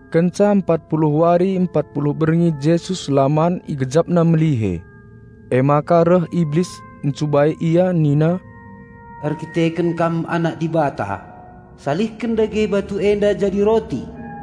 Kenca empat puluh wari empat puluh berngi Jesus la man IgejapNa melihe. Emaka reh Iblis ncubai Ia nina, "Erkiteken Kam Anak Dibata salihken dage batu enda jadi roti."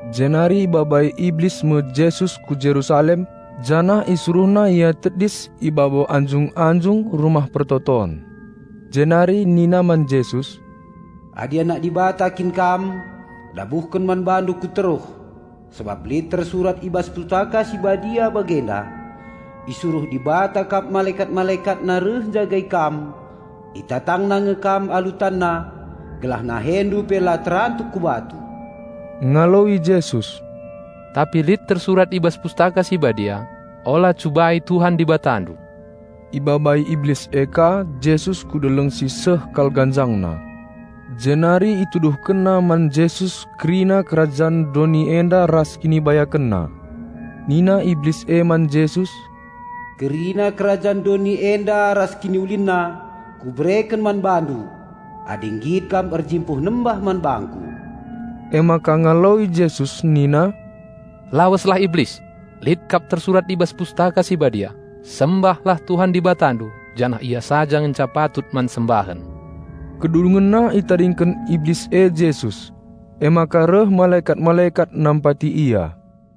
Jenari ibabai Iblis me Jesus ku Jerusalem janah isuruhna Ia tedis i babo anjung-anjung Rumah Pertoton. Jenari nina man Jesus, "Adi Anak Dibata kin kam, dabuhken man BaNdu ku teruh, sabap lit tersurat i bas Pustaka Si Badia bagenda: 'Isuruh Dibata kap malekat-MalekatNa reh njagai Kam, itatangna nge Kam alu tanna gelah NaheNdu pe la terantuk ku batu.'" Ngaloi Jesus, "Tapi lit tersurat i bas Pustaka Si Badia 'Ola cubai Tuhan Dibatandu.'" Ibabai Iblis e ka Jesus ku deleng si seh kal ganjangna. Jenari ituduhkenna man Jesus kerina kerajan doni enda ras kinibayakenna. Nina Iblis e man Jesus, "Kerina kerajan doni enda ras kiniulinna kubereken man BaNdu, adi nggit Kam erjimpuh nembah man bangku." Emaka ngaloi Jesus nina, "Laweslah Iblis! Lit kap tersurat i bas Pustaka Si Badia: 'Sembahlah Tuhan Dibatandu, janah Ia saja ngenca patut man sembahen!'" Kedungenna itadingken Iblis e Jesus; emaka reh malekat-malekat nampati Ia.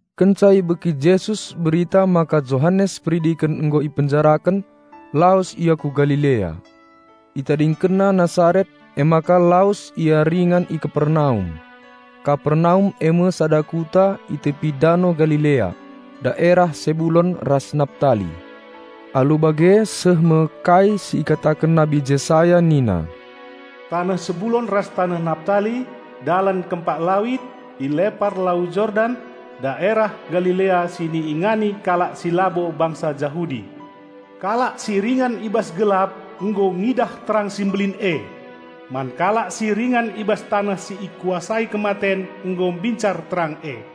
Kenca ibegi Jesus berita maka Johanes Peridiken nggo ipenjaraken, lawes Ia ku Galilea. ItadingkenNa Nasaret emaka lawes Ia ringan i Kapernaum. Kapernaum eme sada kuta i tepi Dano Galilea, daerah Sebulon ras Naptali. Alu bage seh me kai si ikataken Nabi Jesaya nina, "Taneh Sebulon ras taneh Naptali, dalan kempak lawit, i lepar Lau Jordan, daerah Galilea si iingani kalak si labo bangsa Jahudi! Kalak si ringan i bas gelap, nggo ngidah terang si mbelin e! Man kalak si ringan i bas taneh si ikuasai kematen nggo mbincar terang e!"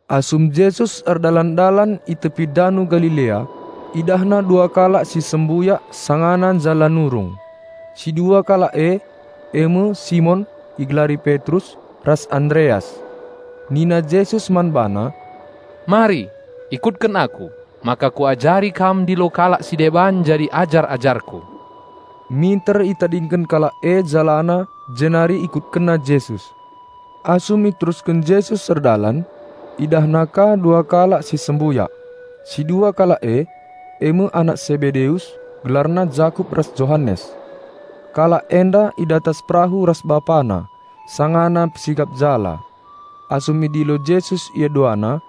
Asum Jesus erdalan-dalan i tepi Dano Galilea, IdahNa dua kalak si sembuyak sangana njala nurung. Si dua kalak e, eme Simon (igelari Petrus) ras Andereas. Nina Jesus man bana, "Mari, ikutken Aku, maka Kuajari kam ndilo kalak si deban jadi ajar-ajarKu." Minter itadingken kalak e jalana jenari IkutkenNa Jesus. Asum iterusken Jesus erdalan, IdahNa ka dua kalak si sembuyak. Si dua kalak e, eme anak Sebedeus, gelarna Jakup ras Johanes. Kalak enda i datas perahu ras bapana sangana mpesikap jala. Asum idilo Jesus ia duana,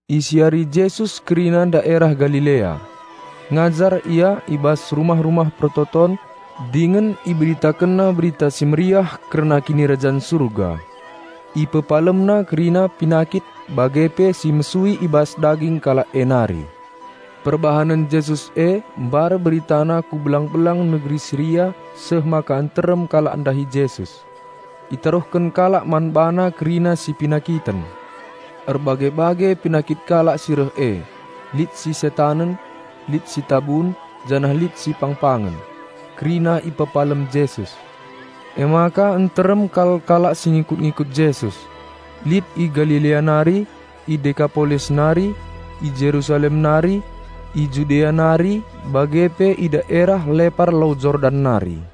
Isiari Jesus kerina daerah Galilea. Ngajar Ia i bas rumah-rumah persembahen dingen IberitakenNa Berita Si Mehuli kerna Kinirajan Surga. IpepalemNa kalak cacat ras kalak penakiten bage pe IpedaratNa si la mehuli i bas daging kalak e nari. Perbahanen Jesus e mbar beritana ku belang-belang negeri Siria seh maka nterem kalak ndahi Jesus. Itaruhken kalak man BaNa kerina si penakiten. Erbage-bage penakit kalak si reh e; lit si setanen, lit si tabun, janah lit si pang-pangen. Kerina ipepalem Jesus. Emaka nterem kal kalak si ngikut-ngikut Jesus; lit i Galilea nari, i Dekapolis nari, i Jerusalem nari; i Judea nari bage pe i daerah lepar Lau Jordan nari.